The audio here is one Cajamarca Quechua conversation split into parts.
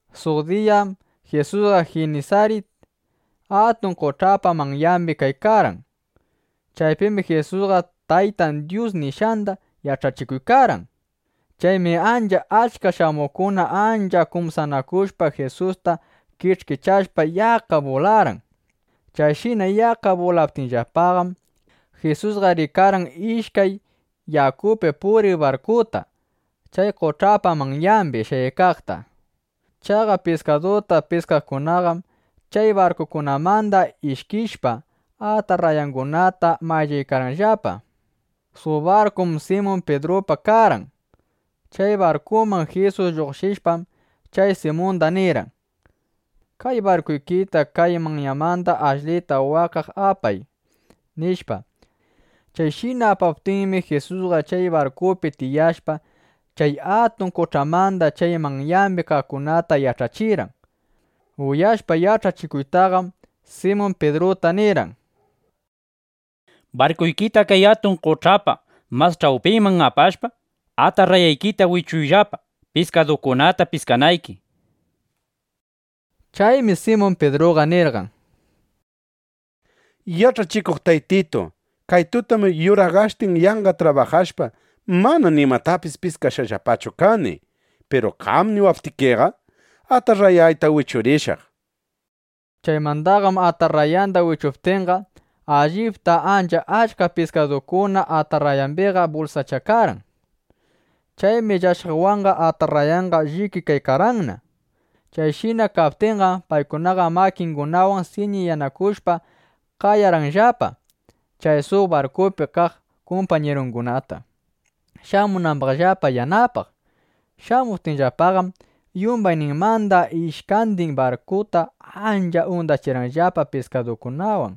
Suq diyam Jisusqa Jinisarit atun qoch'apa manyambi kaykarqan. [Nuta: Chay Jinisarit qoch'allam Galiliya qoch'apis shutiq.] Chaypim Jisusqa Tayta Dyus nishqanda yach'achikuykarqan. Chaymi ancha achka shamuqkuna ancha kumsanakushpa Jisusta kich'kichashpa yaqqa bularqan. Chayshina yaqqa bulaptinllapaqam, Jisusqa rikarqan ishkay yakupi puriq barkuta chay qoch'apa manyambi shayaykaqta. Chaqa piskaduta piskaqkunaqam chay barkukunamanda ishkishpa, atarrayangunata mayllaykarqanllapa. Suq barkum Simun Pidrupa karqan. Chay barkunman Jisus lluqshishpam, chay Simunda nirqan: —Kay barkuykita kay manyamanda ashlita waqkaq apay, nishpa. Chayshina apaptinmi, Jisusqa chay barkupina tiyashpa, chay atun qoch'amanda chay manyambi kaqkunata yach'achirqan. Ushyashpa yach'achikuytaqam, Simun Pidruta nirqan: —Barkuykita kay atun qoch'apa mas ch'awpinman apashpa, atarrayaykita wichuyllapa, piskadukunata piskanayki, nishpa. Chaymi Simun Pidruqa nirqan: —Yach'achikuq Taytitu, kay tutam yuraqashtin yanqa trabajashpa, mana nimatapis piskashqallapachu kani. Piru qam niwaptikiqa, atarrayayta wichurishaq, nishpa. Chaymandaqam atarrayanda wichuptinqa, allipta ancha achka piskadukuna atarrayambiqa bulsachakarqan. Chaymi llashaqwanqa atarrayanqa llikikaykarqanna. Chayshina kaptinqam, paykunaqa makingunawan siñiyakushpa, qayarqanllapa chay suq barkupi kaq kumpañirungunata, shamunambaqllapa yanapaq. Shamuptinllapaqam, yumbayninmanda ishkandin barkuta ancha undachirqanllapa piskadukunawan.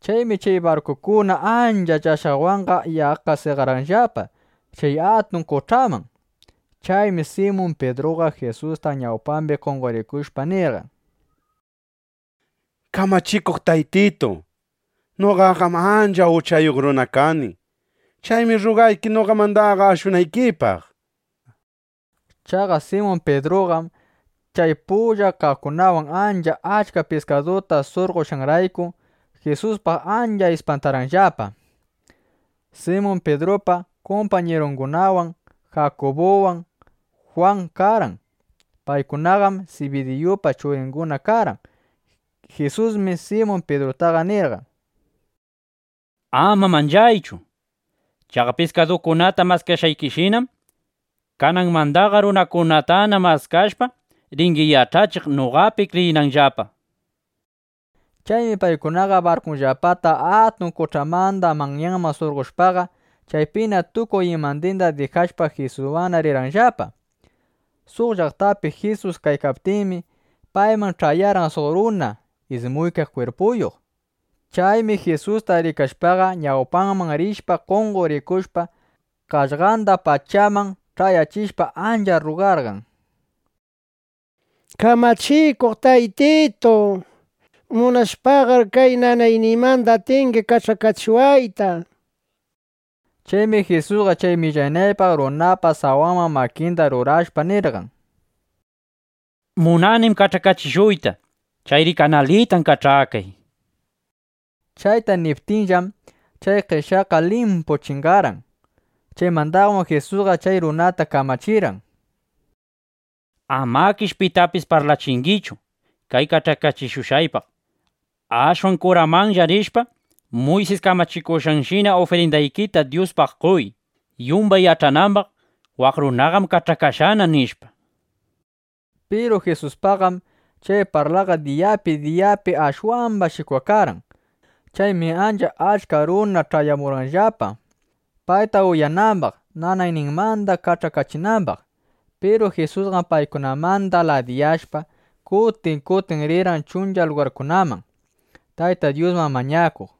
Chaymi chay barkukuna ancha llashaqwanqa yaqqa seqarqanllapa chay atun qoch'aman. Chaymi Simun Pidruqa Jisuspa ñawpambi qonqorikushpa, nirqan: —Kamachikuq Taytitu, noqaqam ancha uchayuq runa kani. Chaymi rrugayki noqamandaqa ashunaykipaq, nishpa. Chaqa Simun Pidruqam chay pullan kaqkunawan ancha achka piskaduta surqoshqanrayku, Jisuspaq ancha ispantarqanllapa. Simun Pidrupa kumpañirungunam Jakubuwan Jwan karqan. Paykunaqam Sibidiyupa churinguna karqan. Jisusmi Simun Pidrutaqa nirqan: —Ama manchaychu. Chaqa piskadukunata maskashqaykishinam, kananmandaqa runakunatana maskashpa, ringi yach'achiq, noqapi kriyinanllapa, nishpa. Chaymi paykunaqa barkunllapata atun qoch'amanda manyanman surqoshpaqa, chaypina tukuy imandinda dijashpa, Jisuswanna rirqanllapa. Suq llaqtapi Jisus kaykaptinmi, payman ch'ayarqan suq runa ismuykaq kwirpuyuq. Chaymi Jisusta rikashpaqa, ñawpanman rishpa, qonqorikushpa, qaqllanda pachaman ch'ayachishpa, ancha rrugarqan: —Kamachikuq Taytitu, munashpaqam kay nanayniymanda atingi kach'akachiwayta, nishpa. Chaymi Jisusqa chay millanaypaq runapa sawanman makinda rurashpa, nirqan: —Munanim kach'akachishuyta. Chayri kanalitan kach'akay, nishpa. Chayta niptinllam, chay qeshyayqa limpu chingarqan. Chaymandaqam Jisusqa chay runata kamachirqan: —Amakish pitapis parlachingichu kay kach'akachishushqaypaq. Ashwan kuramanlla rishpa, Muysis kamachikushqanshina ufrindaykita Dyuspaq qoy, yumbay yach'anambaq: Waq runaqam kach'akashqana, nishpa. Piru Jisuspaqqam chay parlaqa diyapi diyapi ashwamba shikwakarqan. Chaymi ancha achka runa ch'ayamurqanllapa, payta uyanambaq, nanayninmanda kach'akachinambaq. Piru Jisusqam paykunamanda ladiyashpa, kutin kutin rirqan chuncha lugarkunaman, Tayta Dyusman mañakuq.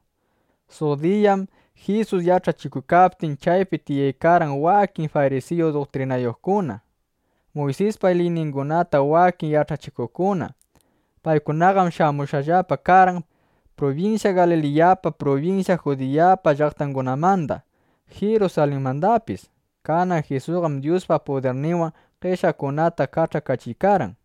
Suq diyam Jisus yach'achikuykaptin, chaypi tiyaykarqan wakin farisiyu duktrinayuqkuna, Muysispa liyningunata wakin yach'achikuqkuna. Paykunaqam shamushqallapa karqan prubinsya Galiliyapa, prubinsya Judiyapa llaqtangunamanda, Jirusalinmandapis. Kanan Jisusqam Dyuspa pudirninwan qeshyaqkunata kach'akachiykarqan.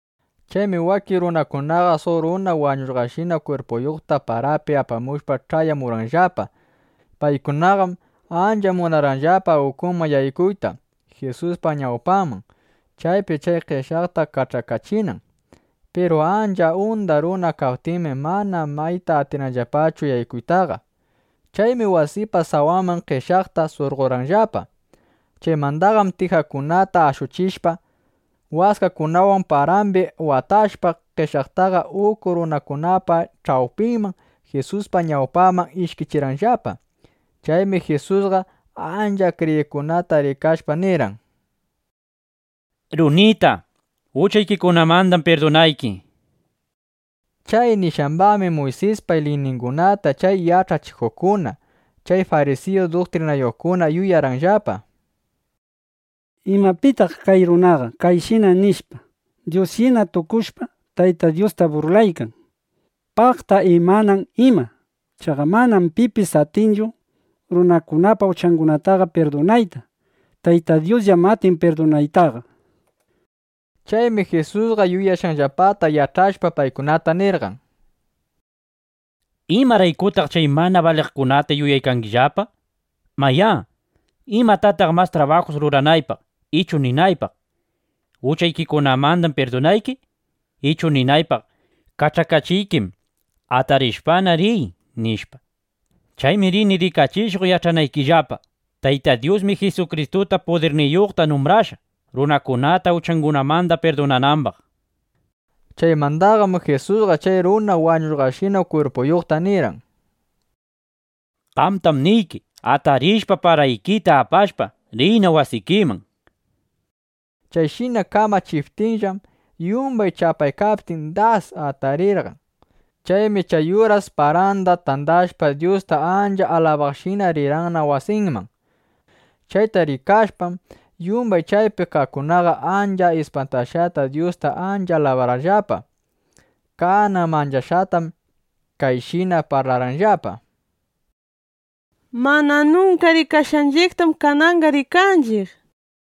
Chaymi wakin runakunaqa suq runa wañushqashina kwirpuyuqta parapi apamushpa, ch'ayamurqanllapa. Paykunaqam ancha munarqanllapa ukuman yaykuyta Jisuspa ñawpanman, chaypi chay qeshyaqta kach'akachinan. Piru ancha unda runa kaptinmi, mana mayta atirqanllapachu yaykuytaqa. Chaymi wasipa sawanman qeshyaqta surqorqanllapa. Chaymandaqam tijakunata ashuchishpa, waskakunawan parambi watashpa, qeshyaqtaqa uku runakunapa ch'awpinman, Jisuspa ñawpanman ishkichirqanllapa. Chaymi Jisusqa ancha kriyiqkunata rikashpa, nirqan: —Runita, uchaykikunamandam pirdunayki, nishpa. Chay nishqambaqmi Muysispa liyningunata chay yach'achikuqkuna, chay farisiyu duktrinayuqkuna yuyarqanllapa: “¿Ima pitaq kay runaqa chayshina nishpa Dyusshina tukushpa, Tayta Dyusta burlaykan? ¡Paqta imanan ima! Chaqa manam pipis atinchu runakunapa uchangunata pirdunayta. Tayta Dyusllam atin pirdunaytaqa”, nishpa. Chaymi Jisusqa yuyashqanllapata yach'ashpa, paykunata nirqan: —¿Imaraykutaq chay mana baliqkunata yuyaykangillapa? Mayá, ¿imataq mas trabajus ruranaypaq, ichu ninaypaq: “Uchaykikunamandam pirdunayki” ichu ninaypaq: “Kach'akachiykim; atarishpana, riy” nishpa? Chaymi rini rikachishuq yach'anaykillapa: Tayta Dyusmi Jisukristuta pudirniyuqta numbrashqa, runakunata uchangunamanda pirdunanambaq, nishpa. Chaymandaqam Jisusqa chay runa wañushqashina kwirpuyuqta nirqan: —Qamtam niyki, atarishpa, paraykita apashpa, riyna wasikiman, nishpa. Chayshina kamachiptinllam, yumbay chapaykaptin, das atarirqan. Chaymi chay uras paranda tandashpa, Dyusta ancha alabaqshina rirqanna wasinman. Chayta rikashpam, yumbay chaypi kaqkunaqa ancha ispantashqata Dyusta ancha alabarqanllapa. Kanan manchashqatam kayshina parlarqanllapa: —Mana nunka rikashqanchiqtam kananqa rikanchiq, nishpa.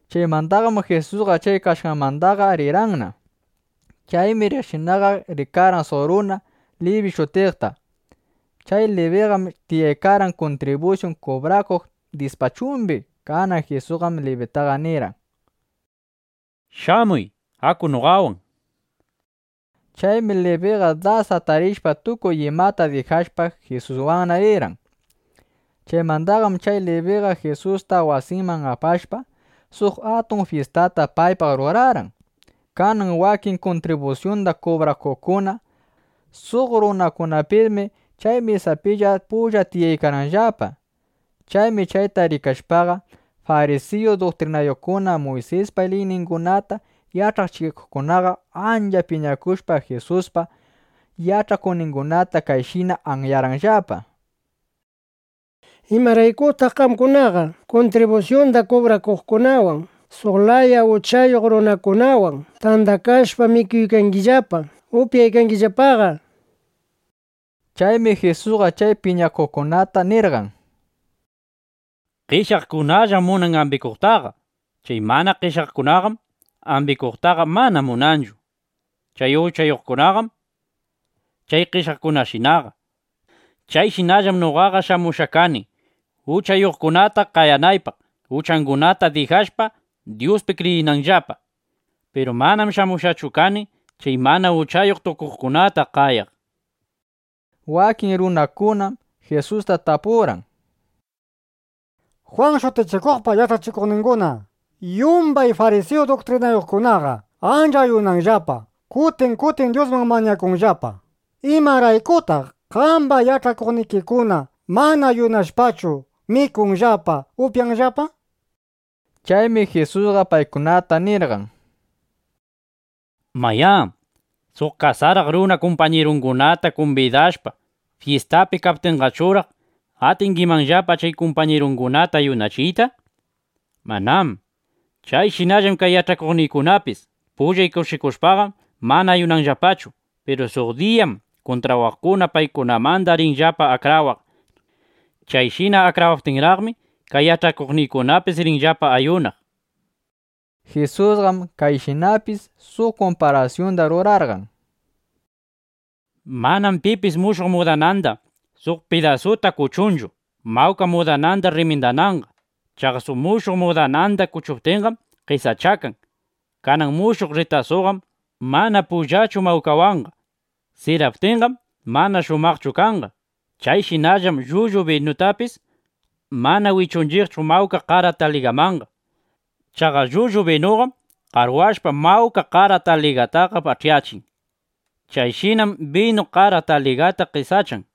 Chaymandaqam Jisusqa chay kashqanmandaqa rirqanna. Chaymi riqshinaqa rikarqan suq runa Libi shutiqta. [Nuta: Chay Libillam Matiyupis shutiq.] Chay Libiqam tiyaykarqan kuntribusyun kubrakunan dispachumbi. Kanan Jisusqam Libitaqa nirqan: —Shamuy, aku noqawan, nishpa. Chaymi Libiqa das atarishpa, tukuy imata dijashpa, Jisuswanna rirqan. Chaymandaqam chay Libiqa Jisusta wasinman apashpa, suq atun fyistata paypaq rurarqan. Kanan wakin kuntribusyunda kubrakuqkuna, suq runakunapismi chay mesapilla pulla tiyaykarqanllapa. Chaymi chayta rikashpaqa, farisiyu duktrinayuqkuna, Muysispa liyningunata yach'achikuqkunaqa ancha piñakushpa, Jisuspa yach'akuqningunata kayshina anyarqanllapa: —¿Imaraykutaq qamkunaqa kuntribusyunda kubrakuqkunawan, suq laya uchayuq runakunawan tandakashpa mikuykangillapa, upyaykangillapaqa? nishpa. Chaymi Jisusqa chay piñakuqkunata nirqan: —Qeshyaqkunallam munan ambikuqtaqa. Chay mana qeshyaqkunaqam ambikuqtaqa mana munanchu. (Kay uchayuqkunaqam chay qeshyaqkunashinaqa.) Chayshinallam noqaqa shamushqa kani uchayuqkunata qayanaypaq, uchangunata dijashpa, Dyuspi kriyinanllapa. Piru manam shamushqachu kani chay mana uchayuq tukuqkunata qayaq, nishpa. Wakin runakunam Jisusta tapurqan: —Jwan Shutichikuqpa yach'akuqninguna, yumbay farisiyu duktrinayuqkunaqa ancha ayunanllapa; kutin kutin Dyusman mañakunllapa. ¿Imaraykutaq qamba yach'akuqnikikuna mana ayunashpachu mikunllapa, upyanllapa? nishpa. Chaymi Jisusqa paykunata nirqan: —Mayá, suq kasaraq runa kumpañirungunata kumbidashpa, fyistapi kaptinqachuraq, ¿atingimanllapa chay kumpañirungunata ayunachiyta? Manám. Chayshinallam kay yach'akuqniykunapis pullay kushikuykashpaqam, mana ayunanllapachu. Piru suq diyam kuntrawaqkuna paykunamanda rinllapa akrawaq. Chayshina akrawaptinraqmi, kay yach'akuqniykunapis rinllapana ayunaq, nishpa. Jisusqam kayshinapis suq kumparasyunda rurarqan: —Manam pipis mushuq mudananmanda suq pidasuta kuchunchu, mawka mudananda rrimindananqa. Chaqa mushuq mudananda kuchuptinqam qesachakan. Kanan mushuq rritasuqam mana pullachu mawkawanqa. Siraptinqam mana shumaqchu kanqa. Chayshinallam llullu binutapis mana wichunchiqchu mawka qara taligamanqa. Chaqa llullu binuqam qarwashpa, mawka qara taligataqa pach'yachin. Chayshinam binu, qara taligaqa qesachakan.